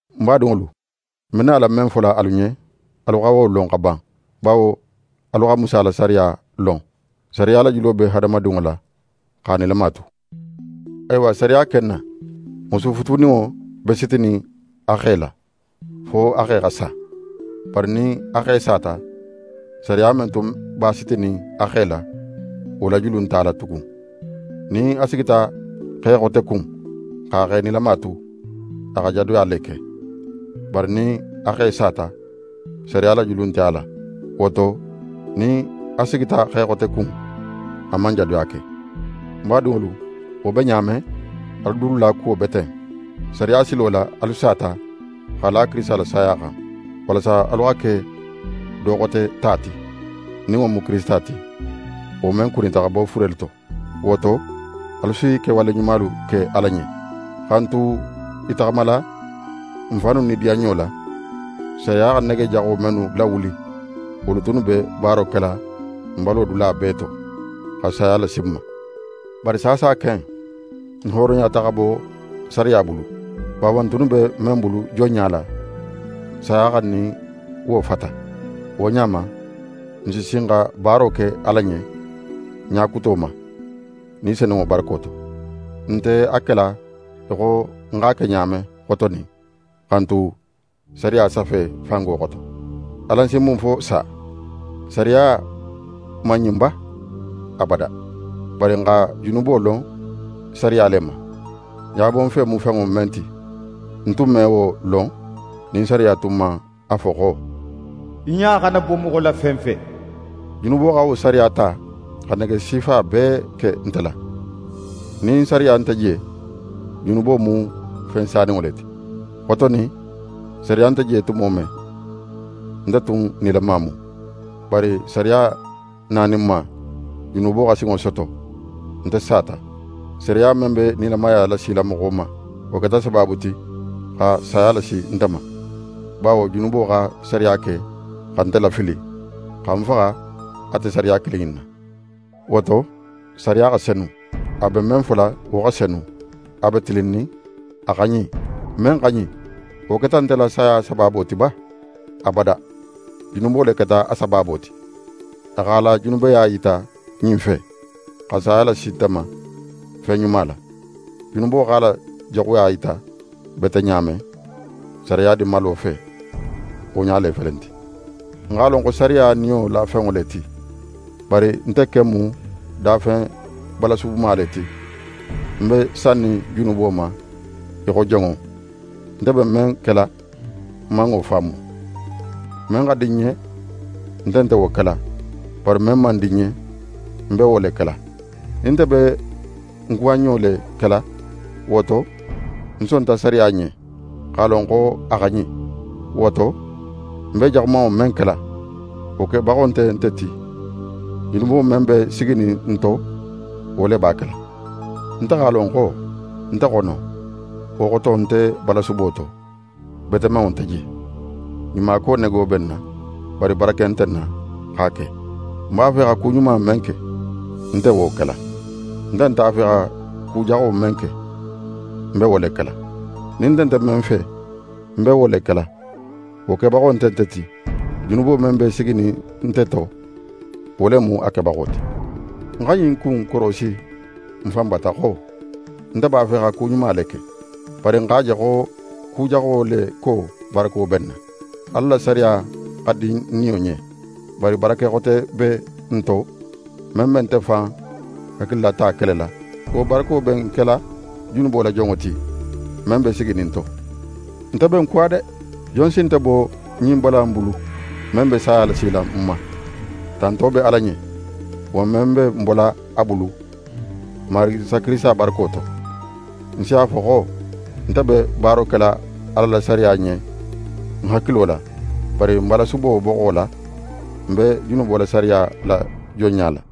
Ń badinŋolu, ń be nala men fola alu ɲen, alu xa wo lon xa ban, bawo alu xa Musa la sariya lon. Sariya la julo be hadamadinŋo la, x'a nilama tu. Awa sariya ken na, musu futuninŋo be sitinin a xe la, fo a xe xa sa. Bari nin a xe sata, sariya men tun b'a sitinin a xe la, wo la julu nt'a la tugun. Nin a sigita xe xote kun x'a xe nilama tu, a xa jadoya le ke. Bari nin a xe sata, sariya la julu nte a la. Wo to, nin a sigita xe xote kun, a man jadoya ke. Ń badinŋolu, wo be ɲa men, alu dulu la kuwo be ten. Sariya silo la, alu sata, x'a la Kirisita la saya xan; walasa alu xa ke do xote ta ti, nin wo mu Kirisita ti, wo men kunita xa bo furelu to. Wo to, alu si kewale ɲumalu ke Ala ɲen. Xa n tu i taxamala n fannu nidiyanɲo la, sariya xa nege jaxo mennu lawuli, wolu tunnu be baaro kela n balo dula bee to, xa saya lasi n ma. Bari saasa ken, n hooroyata xa bo sariya bulu; bawo n tunnu be men bulu jonɲa la, saya xa n nin wo fata. Wo ɲa ma, n si sin xa baaro ke Ala ɲen ɲa kuto ma, Ni Senunŋo barako to. N nte a kela í xo n x'a ke ɲa men xotonin, xa n tu sariya safe fango xoto. Alan si mun fo sa? Sariya man ɲin ba? Abada! Bari ń xa junubo lon sariya le ma. Ɲabonfe mu fenŋo men ti, n tun me wo lon nin sariya tun man a fo xo: «Í ɲa xana bo moxo la fen fe.» Junubo xa wo sariya ta xa nege sifa bee ke nte la. Nin sariya nte je, junubo mu fen saninŋo le ti. Xotonin, sariya nte je tumo men, nte tun nilama mu. Bari sariya naninma, junubo xa sinŋo soto, nte sata: Sariya men be nilamaya lasila moxo ma, wo keta sabaabu ti xa saya lasi nte ma. Bawo junubo xa sariya ke xa nte lafili, xa ń faxa ate sariya kilin in na. Wo to, sariya xa senu. A be men fola, wo xa senu. A be tilinnin, a xa ɲin. Men xa ɲin, wo keta nte la saya sabaabo ti ba? Abada! Junubo le keta a sabaabo ti. A x'a la junubeya yita ɲin fe, xa saya lasi nte ma fen ɲuma la. Junubo x'a la jaxuya yita bete ɲa men, sariya dinmalo fe, wo ɲa le felenti. N x'a lon xo sariya niyo la fenŋo le ti, bari nte ken mu dafen balasubuma le ti. Ń be sannin junubo ma í xo jonŋo. Nte be men kela, ń man wo faamu. Men xa di ń ɲen, ń nte wo kela, bari men man di ń ɲen, ń be wo le kela. Nin nte be ń kuwanɲo le kela, wo to, ń sonta sariya ɲen, x'a lon xo a xa ɲin. Wo to, ń be jaxumanŋo men kela, wo kebaxo nte nte ti. Junubo men be siginin ń to, wo le b'a kela. Nte x'a lon xo, nte xono, wo xoto nte balasubo to, betemanŋo nte je. Ɲumako nego be ń na, bari barake nte ń na x'a ke. Ń b'a fe xa ku ɲuma men ke, ń nte wo kela. Ń nte a fe xa ku jaxo men ke, ń be wo le kela. Nin nte nte men fe, ń be wo le kela, wo kebaxo nte nte ti. Junubo men be siginin nte to, wo le mu a kebaxo ti. Ń xa ɲin ku in korosi ń fan bata xo: Nte b'a fe xa ku ɲuma le ke. Bari ń x'a je xo ku jaxo le ko barako be ń na. Ala la sariya xa di ń niyo ɲen. Bari barake xote be ń to, men be nte fan hakililata kelela. Wo barako be ń kela junubo la jonŋo ti, men be siginin ń to. Nte be ń kuwa de! Jon si nte bo ɲin bala in bulu, men be saya lasila ń ma? Tanto be Ala ɲen, wo men be ń bola a bulu, n Marigi Isa Kirisita barako to! Ń si a fo xo, nte be baaro kela Ala la sariya ɲen ń hakilo la, bari balasubo boxo la, ń be junubo la sariya la jonɲa la.